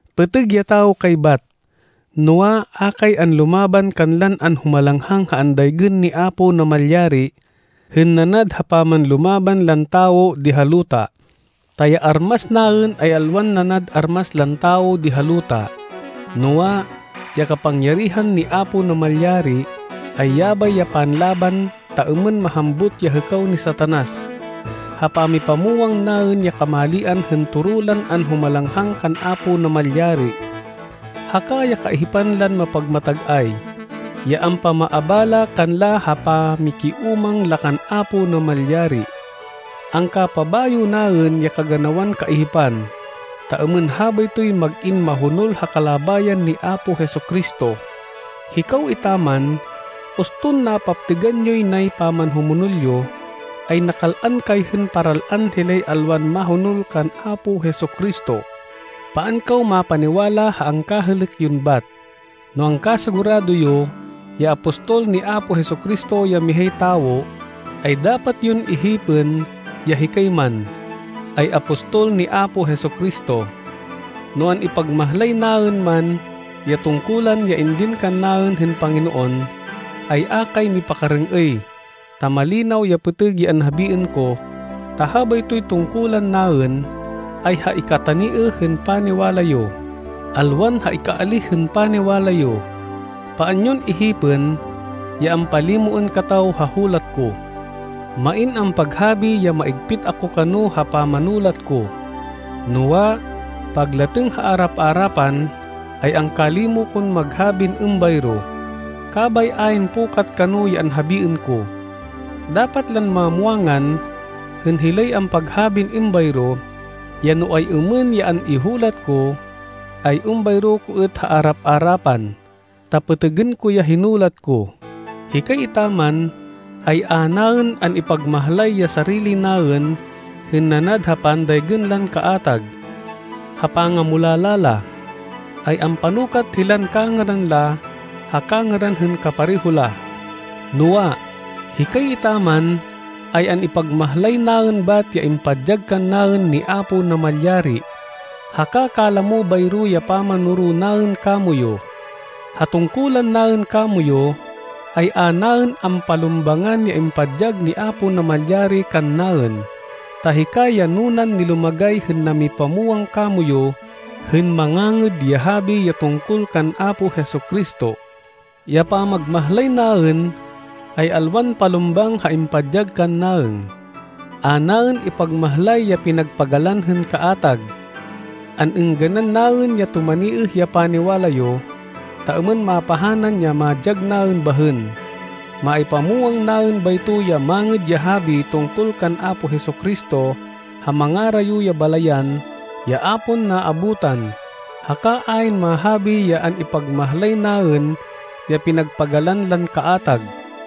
Pêtêg ya tawo kay bat! Noa, a kay anlumaban kanlan anhumalanghang ha andaygên ni Apo Namalyari, hên nanad ha pamanlumaban lan tawo di ha luta. Ta ya armas naên ay alwan nanad armas lan tawo di ha luta. Noa, ya kapangyarihan ni Apo Namalyari, ay yabay ya panlaban ta êmên mahambut ya hêkaw ni Satanas, ha pamipamwang naên ya kamalian hên toro lan anhumalanghang kan Apo Namalyari, haka ya kaihipan lan mapagmatag-ay, ya ampamaabala kanla ha pamikiúmang la kan Apo Namalyari. Angka-pabayo naên ya kaganawan kaihipan, ta êmên habaytoy mag-in mahonol ha kalabayan ni Apo Jesu-Cristo. Hikaw etaman, uston napaptêgan yoy nay pamanhumonol yo, ay nakal-an kay hên paral-an hilay alwan mahonol kan Apo Jesu-Cristo. Paan kaw mapaniwala ha angkahêlêk yon bat! No angkasigurado yo ya apostol ni Apo Jesu-Cristo ya mihay tawo, ay dapat yon ihipên ya hikay man, ay apostol ni Apo Jesu-Cristo. No an-ipagmahlay naên man ya tungkulan ya indin kannaên hên Panginoon, ay a kay mipakarêng-êy ta malinaw ya pêtêg ya anhabiên ko, ta habaytoy tungkulan naên, ay ha ikataniêh hên paniwala yo, alwan ha ikaalíh hên paniwala yo. Paan yon ihipên ya ampalimoên kataw ha hulat ko. Main ampaghabi ya maigpit ako kano ha pamanulat ko, noa, paglatêng ha arap-arapan, ay angkalimo kon maghabin êmbayro, kabay ayn pukat kano ya anhabiên ko. Dapat lan mamwangan hên hilay ampaghabin êmbayro, ya no ay-êmên ya an-ihulat ko, ay êmbayro ko êt ha arap-arapan, ta pêtêgên ko ya hinulat ko. Hikay etaman, ay a naên an-ipagmahlay ya sarili naên hên nanad ha pandaygên lan kaatag. Ha pangamulala la, ay ampanukat hilan kangêran la ha kangêran hên kapareho la. Noa, hikay etaman, ay an-ipagmahlay naên bat ya impadyag kannaên ni Apo Namalyari, haka kalamo bayro ya pamanoro naên kamoyu. Ha tungkulan naên kamoyu, ay a naên ampalumbangan ya impadyag ni Apo Namalyari kannaên, ta hikay ya nunan nilumagay hên namipamwang kamoyu hên Mangangêd ya Habi ya tungkol kan Apo Jesu-Cristo. Ya pamagmahlay naên, ay alwan palumbang ha impadyag kannaên. A naên ipagmahlay ya pinagpagalan hên kaatag. An-êngganan naên ya tumaniêh ya paniwala yo, ta êmên mapahanan ya madyag naên bahên. Maipamwang naên bayto ya Mangêd ya Habi tungkol kan Apo Jesu-Cristo ha mangarayo ya balayan ya a pon naabutan. Haka ayn mahabi ya an-ipagmahlay naên ya pinagpagalan lan kaatag.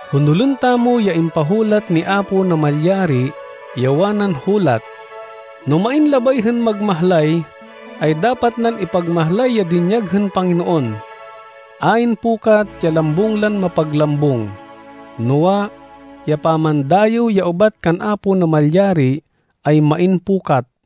Honolên tamo ya impahulat ni Apo Namalyari, ya wanan hulat, “No main labay hên magmahlay, ay dapat nan ipagmahlay ya dinyag hên Panginoon.” Ayn pukat ya lambung lan mapaglambung! Noa, ya pamandayêw ya ubat kan Apo Namalyari ay main pukat.